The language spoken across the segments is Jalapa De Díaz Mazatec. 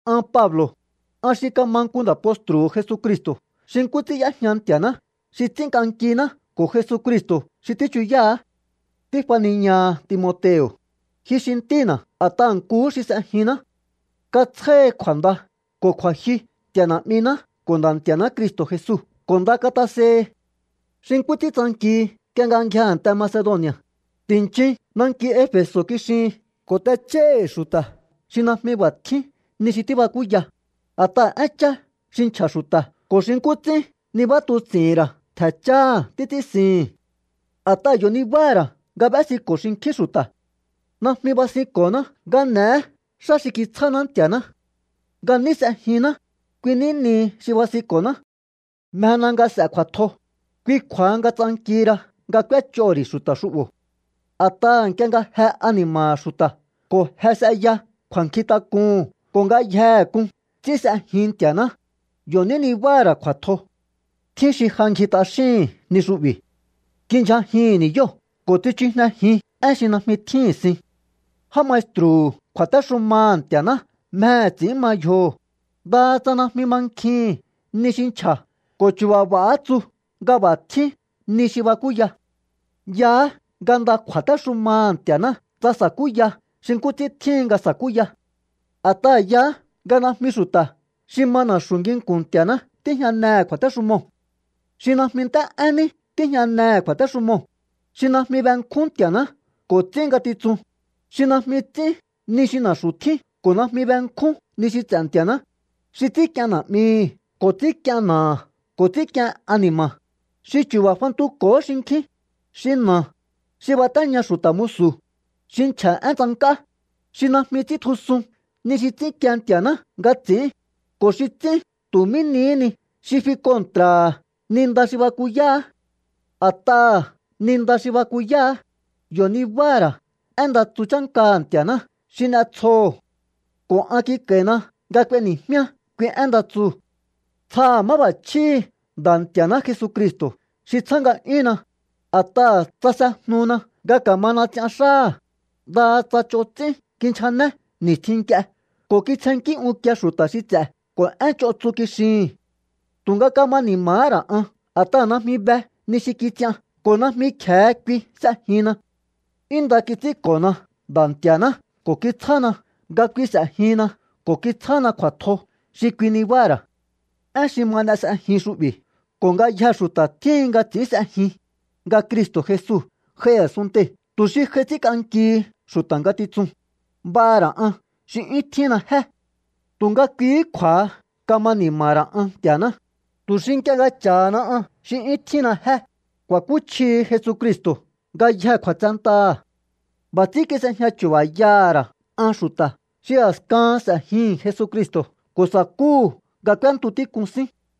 An Pablo̱, an xi kama nku nda̱ postru̱hu̱ Jesucristo̱ xi nkú ts'ín y'éjña Nti̱a̱ná xi ts'ínk'ankiná ko̱ Jesucristo̱ xi tíchuyáha̱á. Tífaniñaha Timoteo̱, ji xi ntína̱ a̱t'aha̱ nkuhú xi s'ejinná. Katsjáhi kju̱a̱nda ko̱ kju̱a̱jyu Nti̱a̱ Na̱'miná ko̱ Nda̱ Nti̱a̱ná Cristo̱ Jesu ko̱ nda katasehi. Xi nkú ts'ín tsankihi nk'ie nga ngjia a̱nte Macedoni̱a̱, ti̱nchin nanki Efe̱so̱ kixihin ko̱ t'ech'óíhi̱ xu̱ta̱ xi najmi b'a̱ tjín ni xi tíbakúya, a̱t'aha̱ énchá xi nchja̱ xu̱ta̱ ko̱ xi nkú ts'ín nibatuts'i̱hi̱n ra̱ ntje̱ cháha̱ títs'ínsihi̱n. A̱t'aha̱ yo̱ nibáha̱ ra̱ nga b'ésiko̱ xinkjín xu̱ta̱. Najmi basinko̱ná nga n'e̱é xá xi kitsjáná Nti̱a̱ná. Nga ní s'ejinná, kui ní nihi xi basinko̱ná. Mjena nga s'e̱ kju̱a̱tjo, kui kju̱a̱ha nga tsankihi ra nga k'úéch'oho̱ ri̱ xu̱ta̱ xu'bo̱. A̱t'aha̱ nk'ie nga je ani̱ma̱ha̱ xu̱ta̱ ko̱ je s'eya kju̱a̱nkjintak'uhu̱n ko̱ ngayjehe k'un ts'ín s'ejin Nti̱a̱ná, yo̱ ní nibáha̱ ra̱ kju̱a̱tjo. Tjín xi ja ngji t'axíhi̱n ni xu'bi̱. Kindyjajihi̱n ni̱yóo̱ ko̱ tsichujnejin én xi najmi tjíhi̱n sin. Já maestru̱hu̱ kju̱a̱téxumaha̱ Nti̱a̱ná mjehe̱ ts'i̱ín ma yjoho̱, ndaha tsa najmi mankjihi̱n ni xi nchja̱ ko̱ chu̱ba̱ b'a̱há tsu nga b'a̱ tjín ni xi bakúya. Yaá nga nda kju̱a̱téxumaha̱ Nti̱a̱ná tsa sa̱kúya xi nkú ts'ín tjíhin nga sa̱kúya. A̱t'aha̱ yaá nga najmi xu̱ta̱ xi ma na̱xu̱ nginku̱n Nti̱a̱ná tíjñanehe̱ kju̱a̱téxumoo̱. Xi najmi nt'é'én ní tíjñanehe̱ kju̱a̱téxumoo̱, xi najmi benkjún Nti̱a̱ná ko̱ ts'ín ngatitsun, xi najmi ts'ín ni xi na̱xu̱ tjín ko̱ najmi benkjún ni xi ts'e̱ Nti̱a̱ná, xi ts'ínk'ien na̱'mihi̱ ko̱ ts'ínk'ien na̱aha̱ ko̱ ts'ínk'ien ani̱ma̱, xi chu̱ba̱ fantuko̱hó xinkjín, xi na̱, xi batéña xu̱ta̱ musu̱, xi nchja̱ én tsank'á, xi najmi ts'íntjusun ni xi ts'ínkie Nti̱a̱ná nga ts'i̱ín, ko̱ xi ts'ín tu̱ mí nihí ni xi fi kontra̱ha̱ ni nda xi bakuyáá. A̱t'aha̱ ni nda xi bakuyáá, yo̱ nibáha̱ ra̱ én nda tsu chánkaha̱ Nti̱a̱ná xi n'etsjoho̱. Ko̱ an kik'a̱i̱na nga k'ueni̱jmíá kui én nda tsuu̱. Tsjaha̱ máb'a̱chjíhi̱ Nda̱ Nti̱a̱ná Jesucristo̱ xi tsjá nga'yúnna, a̱t'aha̱ tsasejnuna nga ka̱mana ts'ian xáha̱, ndaha tsa ch'on ts'ín kinchjané ni̱stjin nk'ie ko̱ kitsjennkí unkie xu̱ta̱ xi ts'e̱ ko̱ én ch'on tsu kixihi̱n. Tu̱nga kama ni̱ma̱há ra̱ an a̱t'aha̱ najmi be ni xi kits'ian ko̱ najmi kje̱e kui s'ejinna. 'Yún nda kits'ínko̱na Nda̱ Nti̱a̱ná ko̱ kitsjána nga kui s'e̱jinna ko̱ kitsjána kju̱a̱tjo xi kui nibáha̱ ra̱. Én xi ma n'e s'ejin xu'bi̱ ko̱ ngayjee̱ xu̱ta̱ tjíhin nga ts'i̱ín s'ejin, nga Cristo̱ Jesu j'ai a̱sunntei̱ tu̱ xi j'ai ts'ínk'ankihi xu̱ta̱ ngatitsun, b'aha̱ ra̱ aṉ xi 'yún tjínna jé. Tu̱nga kuihí kju̱a̱ha kama ni̱ma̱ha̱ ra̱ an Nti̱a̱ná, tu̱ xi nk'ie nga cha̱hana an xi 'yún tjínna jé, ku̱a̱kúchjihi Jesucristo̱ ngayjee̱ kju̱a̱tsentaha̱. B'a̱ ts'ín kis'ejña chu̱ba̱yaha̱ ra̱ an xu̱ta̱ xi a̱skahan s'e̱jihi̱n Jesucristo̱ ko̱ sa̱kúhu̱ nga k'úéntu tík'un sín.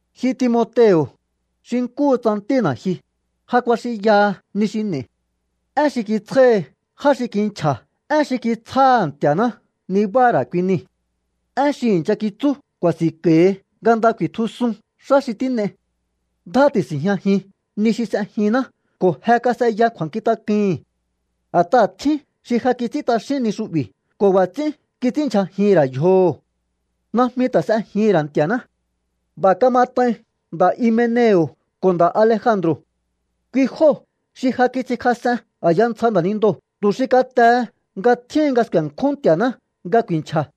Ji Timoteo̱, xi nkúhu tsa ntína̱ ji, ja kuaxinyaha ni xi n'e̱i̱. Én xi kitsjáhi já xi kinchja̱ én xi kitsjáha̱ Nti̱a̱ná nibáha̱ ra̱ kui nii̱. En xi i̱ncha kitsú ku̱a̱si̱nko̱hi nga nda ku̱i̱tjusun xá xi tín'ei. Ndjá ti̱si̱njñajin ni xi s'ejinná ko̱ je kas'eya kju̱a̱nkjintak'uhi̱n. A̱t'aha̱ tjín xi ja kits'ín t'axín ni xu'bi̱ ko̱ b'a̱ ts'ín kits'ínndyjajihi̱n ra̱ yjoho̱. Najmi ta̱ s'ejihi̱n ra̱ Nti̱a̱ná. B'a̱ kamat'ain nda̱ Himeneo̱ ko̱ nda̱ Alejandro̱. Kui jóo̱ xi ja kits'inkjas'en a̱ya ntsja nda̱nindoo̱ tu̱ xi katehe nga tjíhin nga sku̱e̱nkjún Nti̱a̱ná nga ku̱i̱nchja̱.